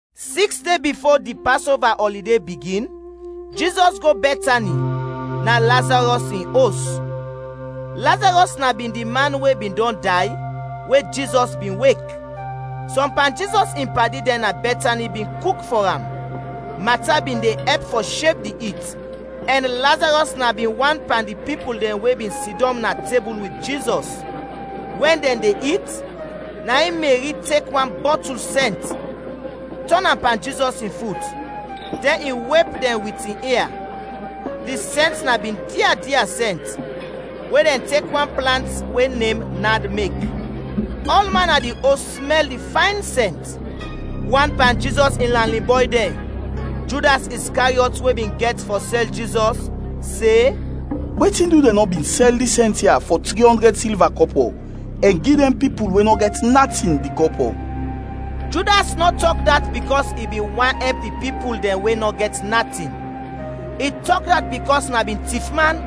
Siks de bifo di Pasova ɔlide bigin, Jizɔs go Bɛtani, na Lazarɔs in os. Lazarɔs na bin di man we bin dɔn day, we Jizɔs bin wek. Sɔm pan Jizɔs in padi dɛn na Bɛtani bin kuk fɔ am. Mata bin de ɛp fɔ sheb di it, ɛn Lazarɔs na bin wan pan di pipul dɛn we bin sidɔm na tebul wit Jizɔs. Wɛn dɛn de it, na in Meri tek wan bɔtul sɛnt tɔn am pan Jizɔs in fut, dɛn i wep dɛn wit in ia; di sɛnt na bin dia dia sɛnt, we dɛn tek wan plant we nem nad mek. Ɔlman na di os smɛl di fayn sɛnt. Wan pan Jizɔs in lanin bɔy dɛn, Judas Iskariɔt we bin gɛt fɔ sɛl Jizɔs, se, “Wetin du dɛn nɔ bin sɛl dis sɛnt ya fɔ tri ɔndrɛd silva kɔpɔ, ɛn gi dɛn pipul we nɔ gɛt natin, di kɔpɔ?” Judas nɔ tɔk dat bikɔs i bin want ɛp di pipul dɛn we nɔ gɛt natin, i tɔk dat bikɔs na bin tifman.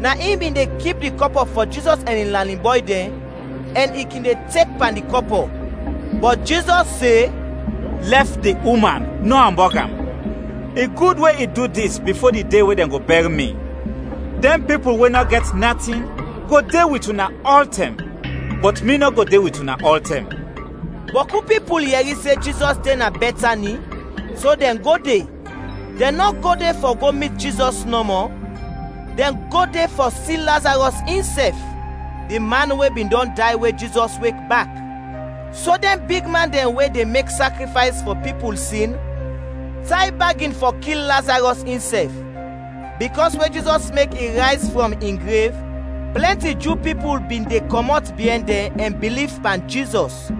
Na in bin de kip di kɔpɔ fɔ Jizɔs ɛn in lanin bɔy dɛn, ɛn i kin de tek pan di kɔpɔ. Bɔt Jizɔs se, “Lɛf di uman, nɔ ambɔg am! I gud we i du dis bifo di de we dɛn go bɛr mi. Dɛn pipul we nɔ gɛt natin go de wit una ɔltɛm, bɔt mi nɔ go de wit una ɔltɛm.” Bɔku pipul yɛri se Jizɔs de na Bɛtani, so dɛn go de. Dɛn nɔ go de fɔ go mit Jizɔs nɔmɔ, dɛn go de fɔ si Lazarɔs insɛf, di man we bin dɔn day we Jizɔs wek bak. So dɛn bigman dɛn we de mek sakrifays fɔ pipul sin tay bagin fɔ kil Lazarɔs insɛf, bikɔs we Jizɔs mek i rayz frɔm in grev, plɛnti Ju pipul bin de kɔmɔt biɛn dɛn ɛn biliv pan Jizɔs.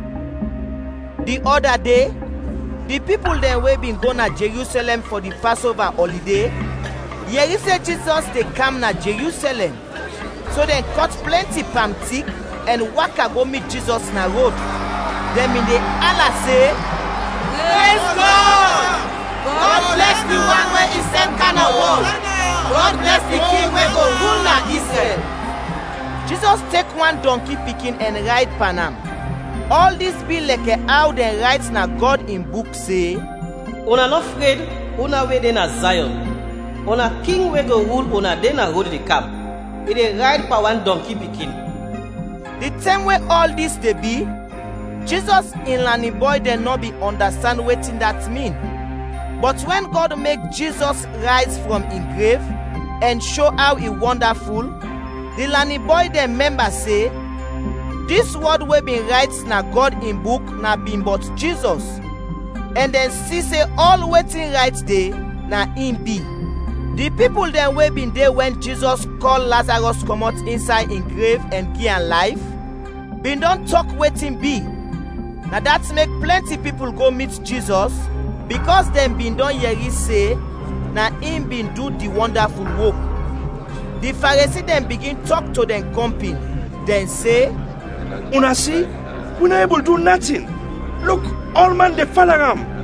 Di ɔda de, di pipul dɛn we bin go na Jerusɛlɛm fɔ di Pasova ɔlide, yɛri se Jizɔs de kam na Jerusɛlɛm. So dɛn kɔt plɛnti pam tik ɛn waka go mit Jizɔs na rod. Dɛn bin de ala se, “Prez Gɔd! Gɔd blɛs di wan we i sɛn kam na wɔl! Gɔd blɛs di King we go rul na Izrɛl!” Jizɔs tek wan dɔnki pikin ɛn rayd pan am. Ɔl dis bi lɛkɛ aw dɛn rayt na Gɔd in Buk se, “Una nɔ fred, una we de na Zayɔn, una king we go rul una de na rod de kam, i de rayd pan wan dɔnki pikin.” Di tɛm we ɔl dis de bi, Jizɔs in lanin bɔy dɛn nɔ bin ɔndastand wetin dat min, bɔt wɛn Gɔd mek Jizɔs rayz frɔm in grev ɛn sho aw i wɔndaful, di lanin bɔy dɛn mɛmba se, dis wɔd we bin rayt na Gɔd in Buk na bin bɔt Jizɔs, ɛn dɛn si se ɔl wetin rayt de, na in bi. Di pipul dɛn we bin de wɛn Jizɔs kɔl Lazarɔs kɔmɔt insay in grev ɛn gi am layf, bin dɔn tɔk wetin bi. Na dat mek plɛnti pipul go mit Jizɔs, bikɔs dɛn bin dɔn yɛri se na in bin du di wɔndaful wok. Di Faresi dɛn bigin tɔk to dɛn kɔmpin, dɛn se, “Una si, wi nɔ ebul du natin! Luk, ɔlman de fala am.”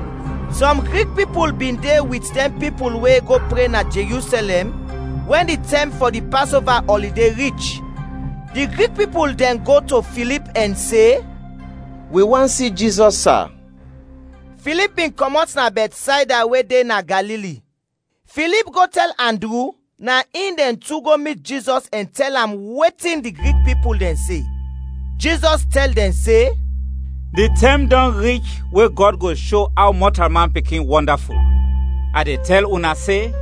Sɔm Grik pipul bin de wit dɛn pipul we go pre na Jerusɛlɛm, wɛn di tɛm fɔ di Pasova ɔlide rich. Di Grik pipul dɛn go to Filip ɛn se, “Wi want si Jizɔs, sa.” Filip bin kɔmɔt na Bɛtsayda we de na Galili. Filip go tɛl Andru, na in dɛn tu go mit Jizɔs ɛn tɛl am wetin di Grik pipul dɛn se. Jizɔs tɛl dɛn se, “Di tɛm dɔn rich we Gɔd go sho aw Mɔtalman Pikin wɔndaful. A de tɛl una se: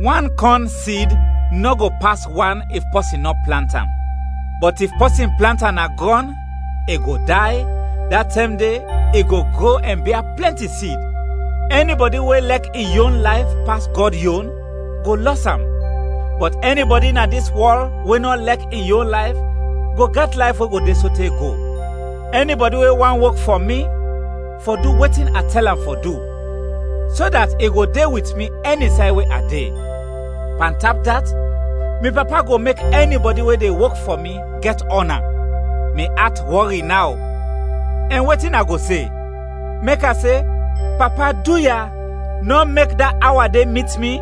wan kɔn sid nɔ go pas wan if pɔsin nɔ plant am. Bɔt if pɔsin plant am na grɔn, i go day, da tɛm de i go gro ɛn bia plɛnti sid. Ɛnibɔdi we lɛk in yon layf pas Gɔd yon, go lɔs am; bɔt ɛnibɔdi na dis wɔl we nɔ lɛk in yon layf go gɛt layf we go de sote go. Ɛnibɔdi we want wok fɔ mi, fɔ du wetin a tɛl am fɔ du, so dat i go de wit mi ɛni say we a de. Pantap dat mi Papa go mek ɛnibɔdi we de wok fɔ mi gɛt ɔna. “Mi at wɔri naw, ɛn wetin a go se? Mek a se, ‘Papa, duya, nɔ mek da awa de mit mi?’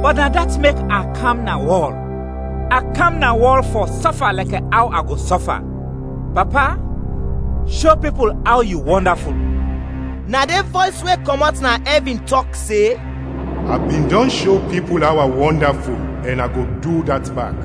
Bɔt na dat mek a kam na wɔl, a kam na wɔl fɔ sɔfa lɛkɛ aw a go sɔfa. Papa, sho pipul aw yu wɔndaful!” Na de vɔys we kɔmɔt na ɛvin tɔk se, “A bin dɔn sho pipul aw a wɔndaful ɛn a go du dat bak.”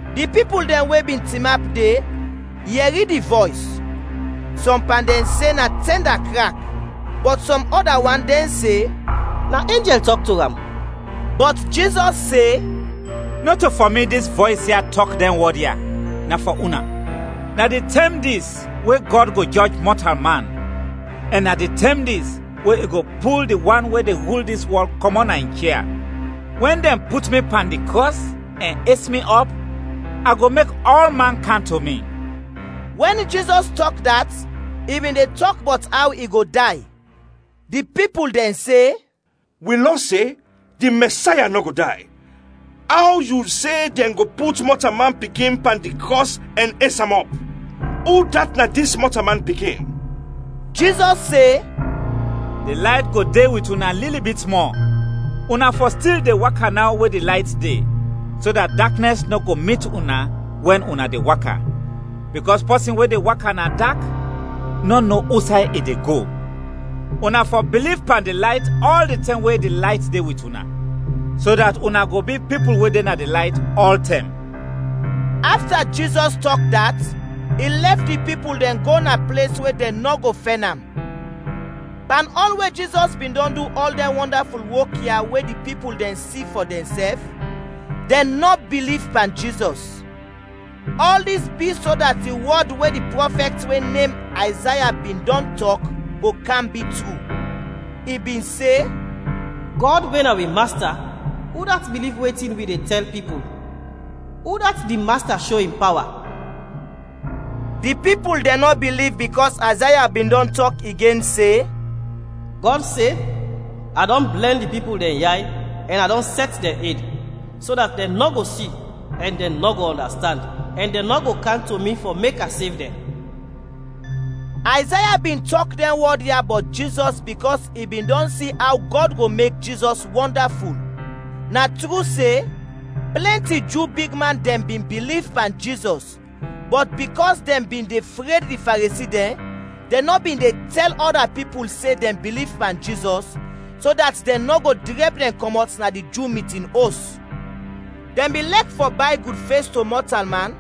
Di pipul dɛn we bin tinap de, yɛri di vɔys. Sɔm pan dɛn se na tɛnda krak, bɔt sɔm ɔda wan dɛn se, “Na enjɛl tɔk to am!” Bɔt Jizɔs se, “Nɔto fɔ mi dis vɔys ya tɔk dɛn wɔd ya, na fɔ una. Na di tɛm dis we Gɔd go jɔj mɔtalman, ɛn na di tɛm dis we i go pul di wan we de rul dis wɔl kɔmɔt na in chia. Wɛn dɛn put mi pan di krɔs ɛn es mi ɔp, a go mek ɔlman kam to mi.” (Wɛn Jizɔs tɔk dat, i bin de tɔk bɔt aw i go day). Di pipul dɛn se, “Wi Lɔ se, di Mɛsaya nɔ go day. Aw yu se dɛn go put Mɔtalman Pikin pan di krɔs ɛn es am ɔp? Udat na dis Mɔtalman Pikin?” Jizɔs se, “Di layt go de wit una lili bit mɔ. Una fɔ stil de waka naw we di layt de, so dat daknɛs nɔ go mit una wɛn una de waka, bikɔs pɔsin we de waka na dak nɔ no usay i de go. Una fɔ biliv pan di layt ɔl di tɛm we di layt de wit una, so dat una go bi pipul we de na di layt ɔltɛm.” Afta Jizɔs tɔk dat, i lɛf di pipul dɛn go na ples we dɛn nɔ go fɛn am. Pan ɔl we Jizɔs bin dɔn du ɔl dɛn wɔndaful wok ya we di pipul dɛn si fɔ dɛnsɛf, dɛn nɔ biliv pan Jizɔs. Ɔl dis bi so dat di wɔd we di prɔfɛt we nem Ayzaya bin dɔn tɔk go kam bi tru. I bin se: “Gɔd, we na wi Masta, udat biliv wetin wi de tɛl pipul? Udat di Masta sho in pawa?” Di pipul dɛn nɔ biliv bikɔs Ayzaya bin dɔn tɔk igen se, “Gɔd se, a dɔn blɛn di pipul dɛn yay ɛn a dɔn sɛt dɛn ed, so dat dɛn nɔ go si, ɛn dɛn nɔ go ɔndastand, ɛn dɛn nɔ go kam to mi fɔ mek a sev dɛn.” Ayzaya bin tɔk dɛn wɔd ya bɔt Jizɔs bikɔs i bin dɔn si aw Gɔd go mek Jizɔs wɔndaful. Na tru se, plɛnti Ju bigman dɛn bin biliv pan Jizɔs, bɔt bikɔs dɛn bin de fred di Faresi dɛn, dɛn nɔ bin de tɛl ɔda pipul se dɛn biliv pan Jizɔs, so dat dɛn nɔ go drɛb dɛn kɔmɔt na di Ju mitin os. Dɛn bin lɛk fɔ bay gudfes to mɔtalman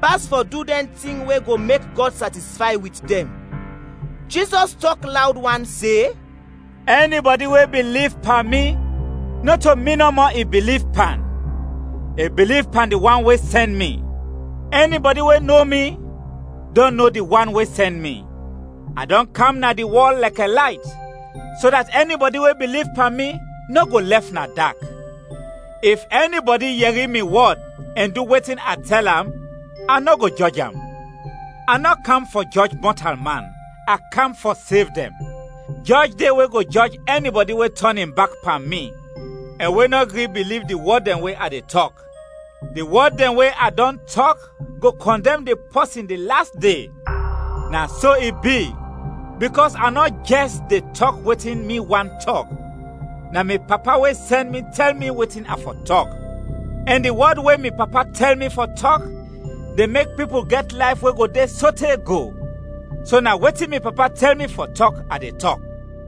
pas fɔ du dɛn tin we go mek Gɔd satisfay wit dɛn. Jizɔs tɔk lawd wan se, “Ɛnibɔdi we biliv pan mi, nɔto mi nɔmɔ i biliv pan, i biliv pan di wan we sɛn mi. Ɛnibɔdi we no mi, dɔn no di wan we sɛn mi. A dɔn kam na di wɔl lɛkɛ layt, so dat ɛnibɔdi we biliv pan mi, nɔ go lɛf na dak. If ɛnibɔdi yɛri mi wɔd ɛn du wetin a tɛl am, a nɔ go jɔj am. A nɔ kam fɔ jɔj mɔtalman, a kam fɔ sev dɛn. Jɔj de we go jɔj ɛnibɔdi we tɔn in bak pan mi ɛn we nɔ gri biliv di wɔd dɛn we a de tɔk. Di wɔd dɛn we a dɔn tɔk go kɔndɛm di pɔsin di las de. Na so i bi, bikɔs a nɔ jɛs de tɔk wetin mi want tɔk, na mi Papa we sɛn mi tɛl mi wetin a fɔ tɔk. Ɛn di wɔd we mi Papa tɛl mi fɔ tɔk de mek pipul gɛt layf we go de sote go. So na wetin mi Papa tɛl mi fɔ tɔk, a de tɔk.”